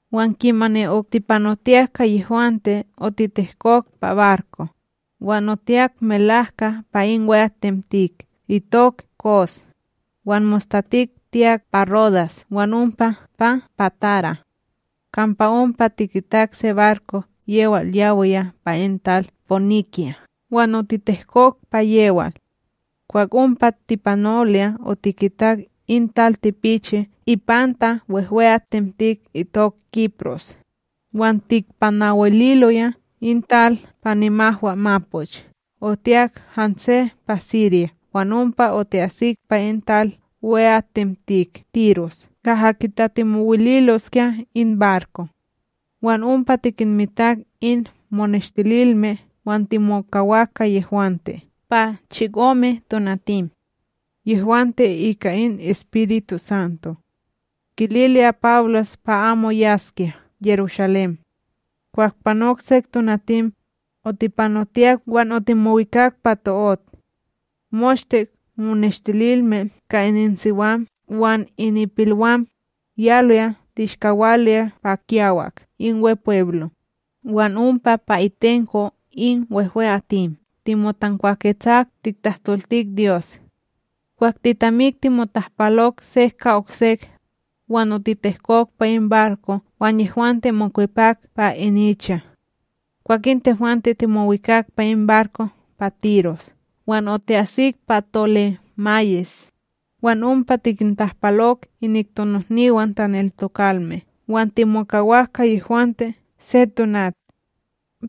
Wan kimani otipanotiyak ka yehwante otitehkok pa barko, wan otiyak melahka pa in wehwe'atim itok Kos, wan mostatik tiyak pa Rodas wan ompa pa Pátara. Kampa ompa tikitak se barko yewal yawiya pa in tal Poynikya wan otitehkok pa yewal. Kwah ompa tipanoloya otikitak in tal tipichi ipanta wehwe'atim itok Kipros, wan tikpanawililoya in tal pa nimahwamapoch otiyak hanse pa Sirya wan ompa oti'asik pa in tal wehwe'atim Tiros kaha kitatimowililoskya in barko. Wan ompa tikinmitak in moneshtililme wan timokawak ka yehwante pa chikome tonatim. Yehwante ika in EspirituSanto, kililoya Pawlos pa amo yaskya Yerushalém. Kwah panok sek tonatim, otipanotiyak wan otimowikak pa to'ot. Moshte moneshtililme ka ininsiwam wan ininpilwam, yaloya tishkawaloya pa kiyawak in Wepweblo, wan ompa pa itenko in wehwe'atim, timotankwaketsak tiktahtoltik Dyos. Kwah titamik timotahpalok sek ka oksek, wan otitehkok pa in barko wan yehwante mokwepak pa ininicha. Kwakin tehwante timowikak pa in barko pa Tiros wan oti'asik pa Tolemayis, wan ompa tikintahpalok inik tonihniwam taneltokalme wan timokawak ka yehwante se tonat.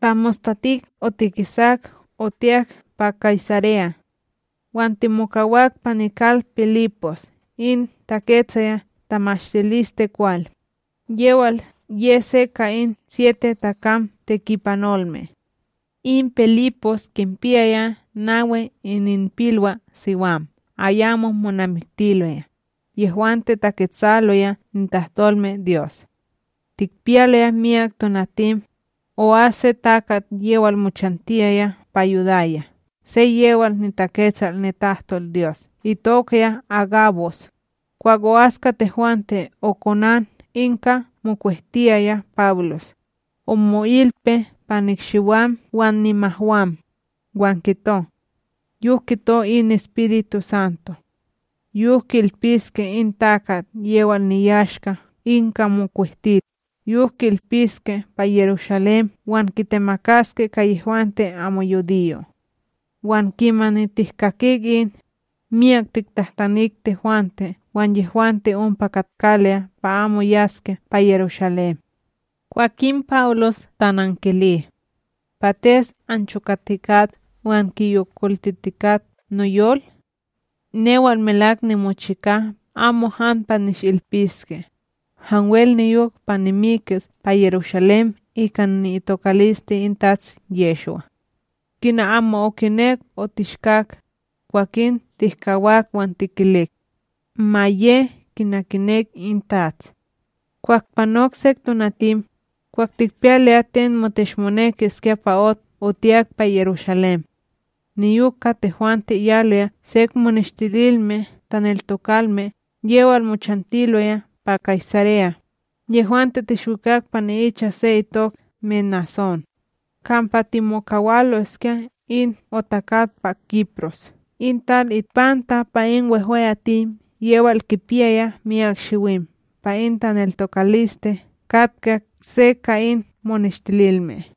Pa mostatik otikisak otiyak pa Kaysareya. Wan timokawak pa nikal Pilipos in taketsaya tamashtilisteKwal, yewal ye se ka in chikome takam tekipanolme. In Pilipos kinpiyaya nawi ininpilwaSiwam ayamo monamiktiloya, yehwante taketsaloya nitahtolmeDyos. Tikpiyaloya miyak tonatim, o'as se takat yewal mochantiyaya pa Yudaya se yewal niTaketsal nitahtolDyos itokaya Ágabos, kwah o'as ka tehwante okonan in ka mokwehtiyaya Pawlos, omo'ilpi pa nikshiwam wan nimahwam, wan kito: —Yok kito in EspirituSanto: yok ki'ilpiske in takat yewal niyashka in ka mokwehtil yok ki'ilpiske pa Yerushalém wan kitemakaske ka yehwante amo yudiyo'. Wan kimani tihkakik in, miyak tiktahtanik tehwante wan yehwante ompa katkaloya pa amo yaskya pa Yerushalém. Kwakin Pawlos tanankili: —Pates anchokatikat wan kiyolkokoltitikat noyol? Newal melak nimochika amo han pa nishilpiske, hanwel niyok pa nimikis pa Yerushalém ika ni'itokaliste in Tats Yehshwa. Kina amo okinek otishkak, kwakin tihkawak wan tikilik: —Ma ye kina kinek in TATS. Kwah panok sek tonatim, kwah tikpiyaloya ten moteshmonekiskya pa ot otiyak pa Yerushalém. Niyok ka tehwante yaloya sek moneshtililme taneltokalme yewal mochantiloya pa Kaysareya, yehwante tishwikak pa ni'icha se itok Menasón, kampa timokawaloskya in otakat pa Kipros in tal ipanta pa in wehwe'atim yewal kipiyaya miyak shiwim pa in taneltokaliste katka se ka in moneshtililme.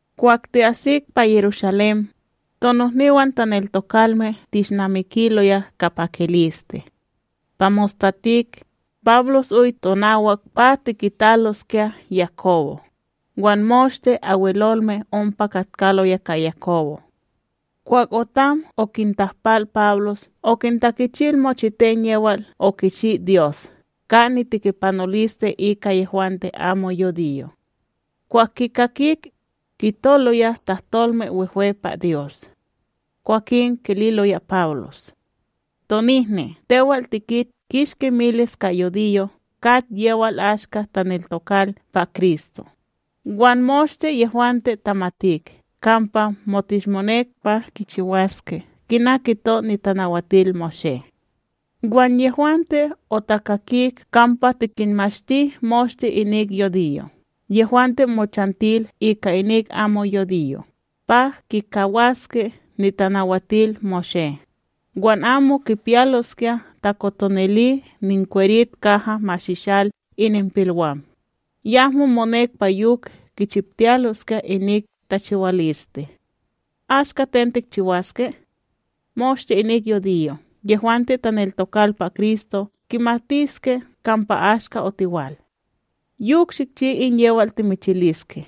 Kwah ti'asik pa Yerushalém, tonohniwan taneltokalme tishnamikiloya ka pakiliste. Pa mostatik, Pawlos oy tonawak pa tikitaloskya Yakobo, wan moshte Abwelolme Wehwetsim ompa katkaloya ka Yakobo. Kwah otam okintahpal Pawlos okintakichil mochiten yewal okichi Dyos ka nitekipanoliste ika yehwante amo yudiyo'. Kwah kikakik, kitoloya tahtolme wehwe pa Dyos. Kwakin kililoya Pawlos: —Tonihni, tewal tikit kishki miles ka yudiyo' kat yewal ashka taneltokal pa Kristo, wan moshte yehwante tamatik kampa motishmonek pa kichiwaske kina kito NitanawatilMoshé. Wan yehwante otakakik kampa tikinmashti moshte inik yudiyo' yehwante mochantil ika inik amo yudiyo' pa kikawaske NitanawatilMoshé, wan amo kipiyaloskya takotonili nikwerit kaha mashishal ininpilwam, yahmo monek pa yok kichiptiloskya inik tachiwaliste. Ashka ten tikchiwaske? Moshte in yudiyo' yehwante taneltokal pa Kristo kimatiske kampa ashka otiwal. Yok shikchi in yewal timichiliske: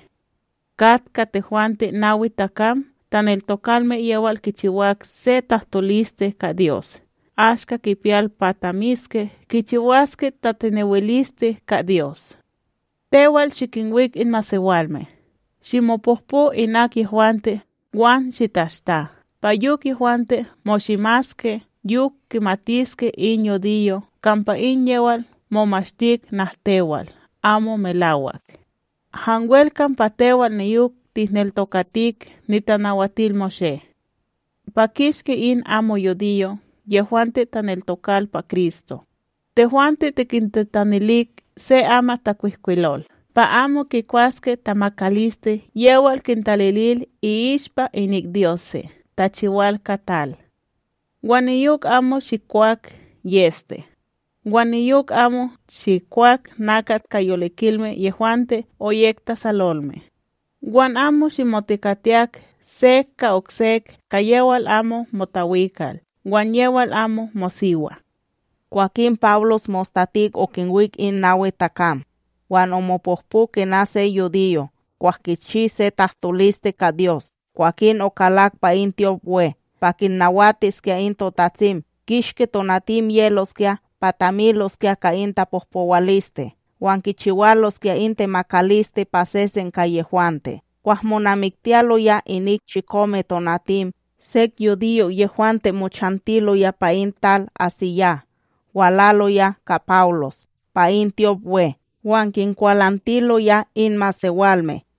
Kat ka tehwante nawi takam taneltokalme yewal kichiwak se tahtoliste ka Dyos ashka kipiyal pa tamiske kichiwaske tatinewiliste ka Dyos. Tewal shikinwik in masewalme, shimopohpo inak yehwante wan shitashta, pa yok yehwante moshimaske. Yok kimatiske in yudiyo' kampa in yewal momashtik nahtewal amo melawak, hanwel kampa tewal niyok tihneltokatik NitanawatilMoshé. Pa kishki in amo yudiyo' yehwante taneltokal pa Kristo, tehwante tikintitanilik se amatTakwihkwilol pa amo kikwaske tamakaliste yewal kintalilil i'ishpa inik dyose' tachiwal ka tal, wan niyok amo shikwak yEste, wan niyok amo shikwak nakat ka yolikilme yehwante oyek tasalolme, wan amo shimotekatiyak sek ka oksek ka yewal amo motawikal wan yewal amo mosiwa. Kwakin Pawlos mostatik okinwik in nawi takam, wan omopohpo kina se yudiyo kwah kichi se tahtoliste ka Dyos kwakin okalak pa in tyopWe pa kinnawatiskya in totatsim kishki tonatim yeloskya pa tamiloskya ka in tapohpowaliste wan kichiwaloskya in temakaliste pa sesen ka yehwante. Kwah monamiktiyaloya inik chikome tonatim, sek yudiyo' yehwante mochantiloya pa in tal AsíYah walaloya ka Pawlos pa in tyopWe wan kinkwalantiloya in masewalme.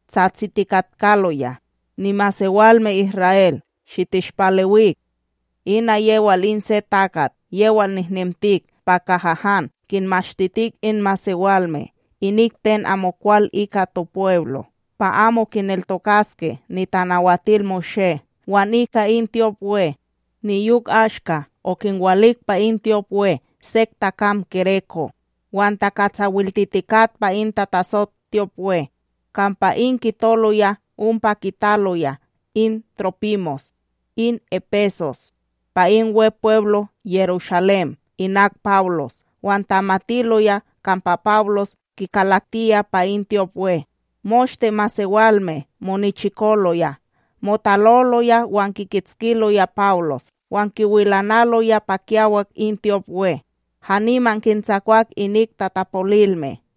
tsatsitikatkaloya: —Nimasewalme Isra'El, shitishpalewik! Ina yewal in se takat yewal nihnemtik pa kaha han kinmashtitik in masewalme inik ten amokwal ika topweblo, pa amo kineltokaske NitanawatilMoshé wan ika in tyopWe; niyok ashka okinwalik pa in tyopWe sek takam gereko', wan takatsawaltitikat pa in tatasot tyopWe. Kampa in kitoloya ompa kitaloya in Trópimos, in Epesos, pa in Wepweblo Yerushalém inak Pawlos wan tamatiloya kampa Pawlos kikalaktiya pa in tyopWe. Moshte masewalme monichikoloya, motaloloya wan kikitskiloya Pawlos wan kiwilanaloya pa kiyawak in tyopWe, haniman kintsakwak inik tatapolilme.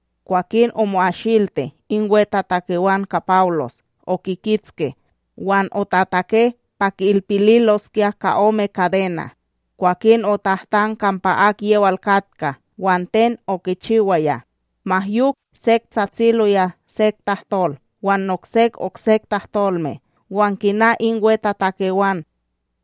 Kwakin omo'asilti in wetatakewan ka Pawlos, okikitski wan otatake pa ki'ilpililoskya ka ome kadena. Kwakin otahtan kampa akyewal katka wan ten okichiwaya. Ma yok sek tsatsiloya sek tahtol wan noksek okse tahtolme, wan kina in wetatakewan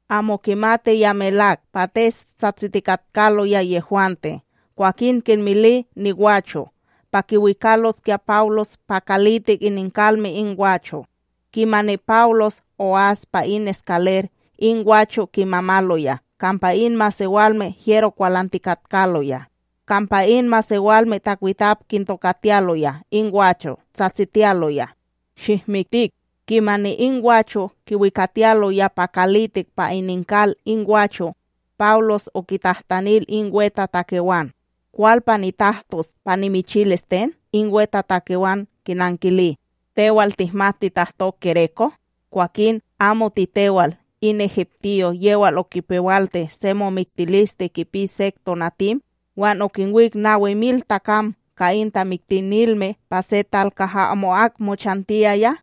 amo kimatiya melak pates tsatsitikatkaloya yehwante, kwakin kinmili nigwacho' pa kiwikaloskya Pawlos pa kalitik ininkalme in gwacho'. Kimani Pawlos o'as pa in eskaler, in gwacho' kimamaloya kampa in masewalme hyero kwalantikatkaloya; kampa in masewalme takwitap kintokatiyaloya in gwacho' tsatsitiyaloya: —Shihmiktik! Kimani in gwacho' kiwikatiyaloya pa kalitik pa ininkal in gwacho', Pawlos okitahtanil in wetatakewan: —Kwal pa nitahtos pa nimichilis ten? In wetatakewan kinankili: —Tewal tihmat titahto gereko? Kwakin, amo titewal in egiptiyo yewal okipewalti se momiktiliste kipi sek tonatim wan okinwik nawi mil takam ka in tamiktinilme pa se tal kaha amo'ak mochantiyaya?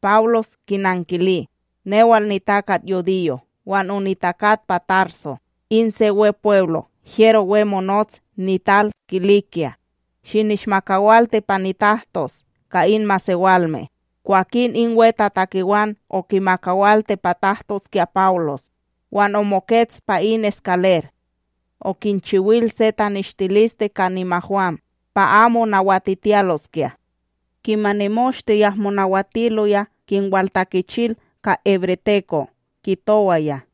Pawlos kinankili: —Newal nitakat yudiyo, wan onitakat pa Tarso, in se Wepweblo hyero we monots nital Kilikya; shinishmakawalti pa nitahtos ka in masewalme. Kwakin in wetatakewan okimakawalti pa tahtoskya Pawlos, wan omokets pa in eskaler, okinchiwil se taneshtiliste ka nimahwam pa amo nawatitiyaloskya. Kimani moshte yahmo nawatiloya, kinwaltakichil ka hebreteko, kitowaya: